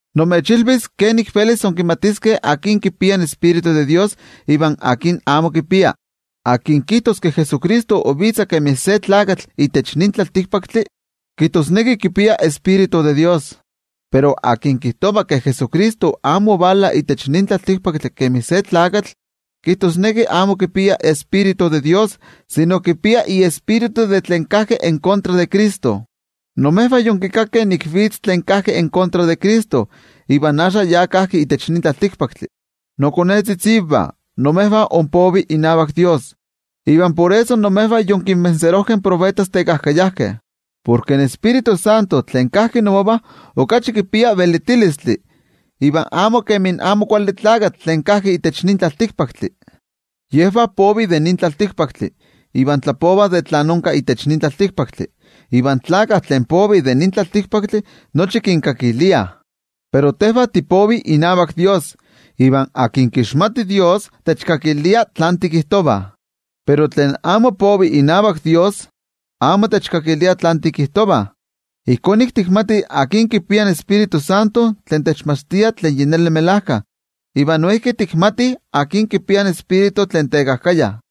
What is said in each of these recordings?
Nimechilvis kenik velis inkimatiskeh akin kipia iTioijyotzi in Dios iva akin amo kipia. Tlen kijtos ke Jesucristo ovitza kemi se tlakatl itech nin tlaltikpaktli, kijtosneki kipia iTioijyotzi in Dios. Pero tlen kijtova ke Jesucristo amo ovala itech nin tlaltikpaktli kemi se tlakatl, kijtosneki amo kipia iTioijyotzi in Dios sino kipia iejekayo tlen kajki en kontra de Cristo. Imejvah yonkikakeh nik vitz tlen kajki en kontra de Cristo, iva axka ya kajki itech nin tlaltikpaktli. Nokonetzitzivah, imejvah inpovih inavak toYejwatzi, iva por eso imejvah yonkintlanilijkeh in tiotenejmachtijkeh tekajkayajkeh. Porke in Tioijyotzintli tlen kajki inmovah okachi kipia velitilistli iva amo kemi in Amo Kuali Tlakatl tlen kajki itech nin tlaltikpaktli. Yejvah povih de nin tlaltikpaktli, iva tlapovah de tlen onka itech nin tlaltikpaktli iva in tlakah tlen povih de nin tlaltikpaktli nochi kinkakiliah. Pero tejvah tipovih inavak toYejwatzi. Iva se tlen kixmati Dios, techkakilia tlen tikijtovah. Pero tlen amo povi inavak toYejwatzi, amo techkakilia tlen tikijtovah. Ijkó nik tikmatih akin kipia in Tioijyotzintli tlen techmachtia tlen melajkayotl, iva noijki tikmatih akin kipia in ejekatl tlen tekajkaya.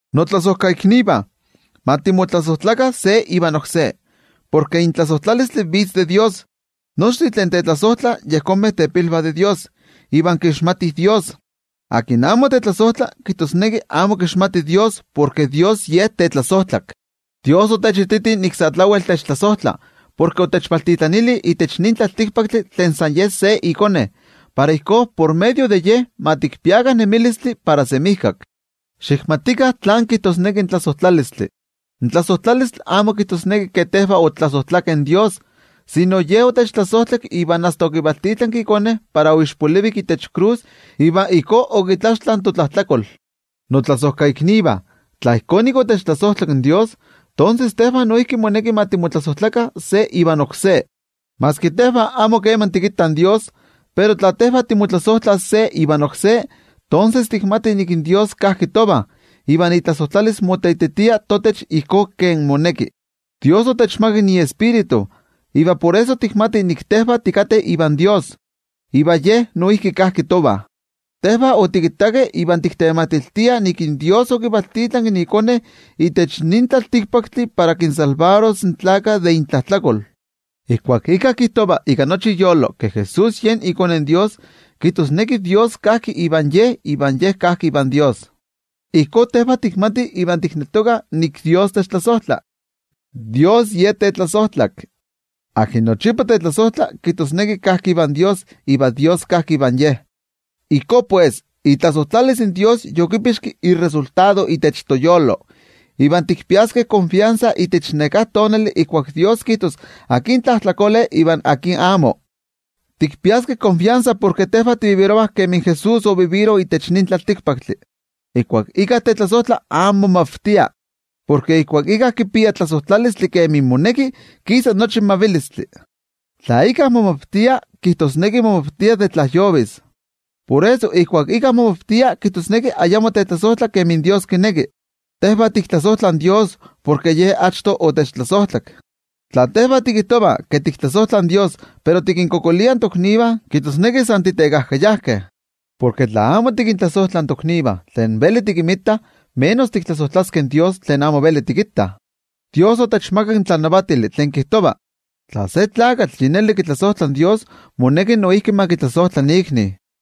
Notlasojkaiknivah, ma timotlasojtlakah se ivan oksé, porke in tlasojtlalistli vitz de toYejwatzi. Nochtin tlen tetlasojtlah yejonmeh tepilvah de Dios iva kixmatih Dios. Tlen amo tetlasojtla, kijtosneki amo kixmati Dios, porke Dios Ye tetlasojtlak. In toYejwatzi otechititi nik sa tlawel techtlasojtla porke otechvaltitlanili itech nin tlaltikpaktli tlen san ye se iKone, para ijkó, por medio de Ye ma tikpiakah nemilistli para semijkak. Xikmatikah tlán kijtosneki in tlasojtlalistli. In tlasojtlalistli amo kijtosneki ke tejvah otiktlasojtlakeh in toYejwatzi, sino Ye otechtlasojtlak iva asta okivaltitlanki iKone para oixpolivik itech krus iva ijkó okitlaxtla totlajtlakol. Notlasojkaiknivah, tla ijkó nik otechtlasojtlak in toYejwatzi, tonses tejvah noijki moneki ma timotlasojtlakah se ivan oksé. Maski tejvah amo keman tikittah in toYejwatzi, pero tla tejvah timotlasojtlah se ivan oksé, tonses tikmatih ke toYejwatzi kajki tovah, iva itlasojtlalis moteititia totech ijkó kemi moneki. In toYejwatzi otechmakak iTioijyotzi, iva por eso tikmatih nik in tejvah tikateh Iva iva Ye noijki kajki tovah. Tejvah otikittakeh iva tiktematiltiah ke toYejwatzi okivaltitlanki iKone itech nin tlaltikpaktli para kinmakixtis in tlaltikpaktlakah de intlajtlakol. Ijkuak íkka kijtova ika nochi iyolo ke Jesús yen iKone in Dios, kijtosneki Dios kajki ivan ye, iva ye kajki ivan Dios. Ijkó nik tikmatih iva tikneltokah ke toYejwatzi techtlasojtla. In toYejwatzi Ye tetlasojtlak. Tlen nochipa tetlasojtla, kijtosneki kajki ivan Dios, iva Dios kajki ivan ye. Ijkó pues, itlasojtlalis in toYejwatzi motlami yektik itech toyolo, iva tikpiaskeh netenmachilistli itech neká tonali ijkuak Dios kijtos akin tlajtlakole iva akin amo. Tikpiaskeh netenmachilistli porke tejvah tinemih kemi Jesús onenki itech nin tlaltikpaktli. Ijkuak íkka tetlasojtla amo momavtia. Porke ijkuak íkka kipia tlasojtlalistli kemi moneki, kisa nochi in mavilistli. Tla íkka momavtia, kijtosneki momavtia de tlajyovis. Por eso, ijkuak íkka momavtia, kijtosneki ayamo tetlasojtla kemi Dios kineki. Tejvah tiktlasojtlah in toYejwatzi porke Ye achto otechtlasojtlak. Tla tejvah tikijtovah ke tiktlasojtlah in toYejwatzi, pero tikinkualankaitah toknivah, kijtosneki san titekajkayajkeh. Porke tla amo tikintlasojtlah in toknivah tlen veli tikinmitah, ¿kenik velis tiktlasojtlaskeh in toYejwatzi tlen amo veli tikittah? In toYejwatzi otechmakak in tlanavatili tlen kijtova: tla se tlakatl yi neli kitlasojtla in Dios moneki noijki ma kitlasojtla ikni.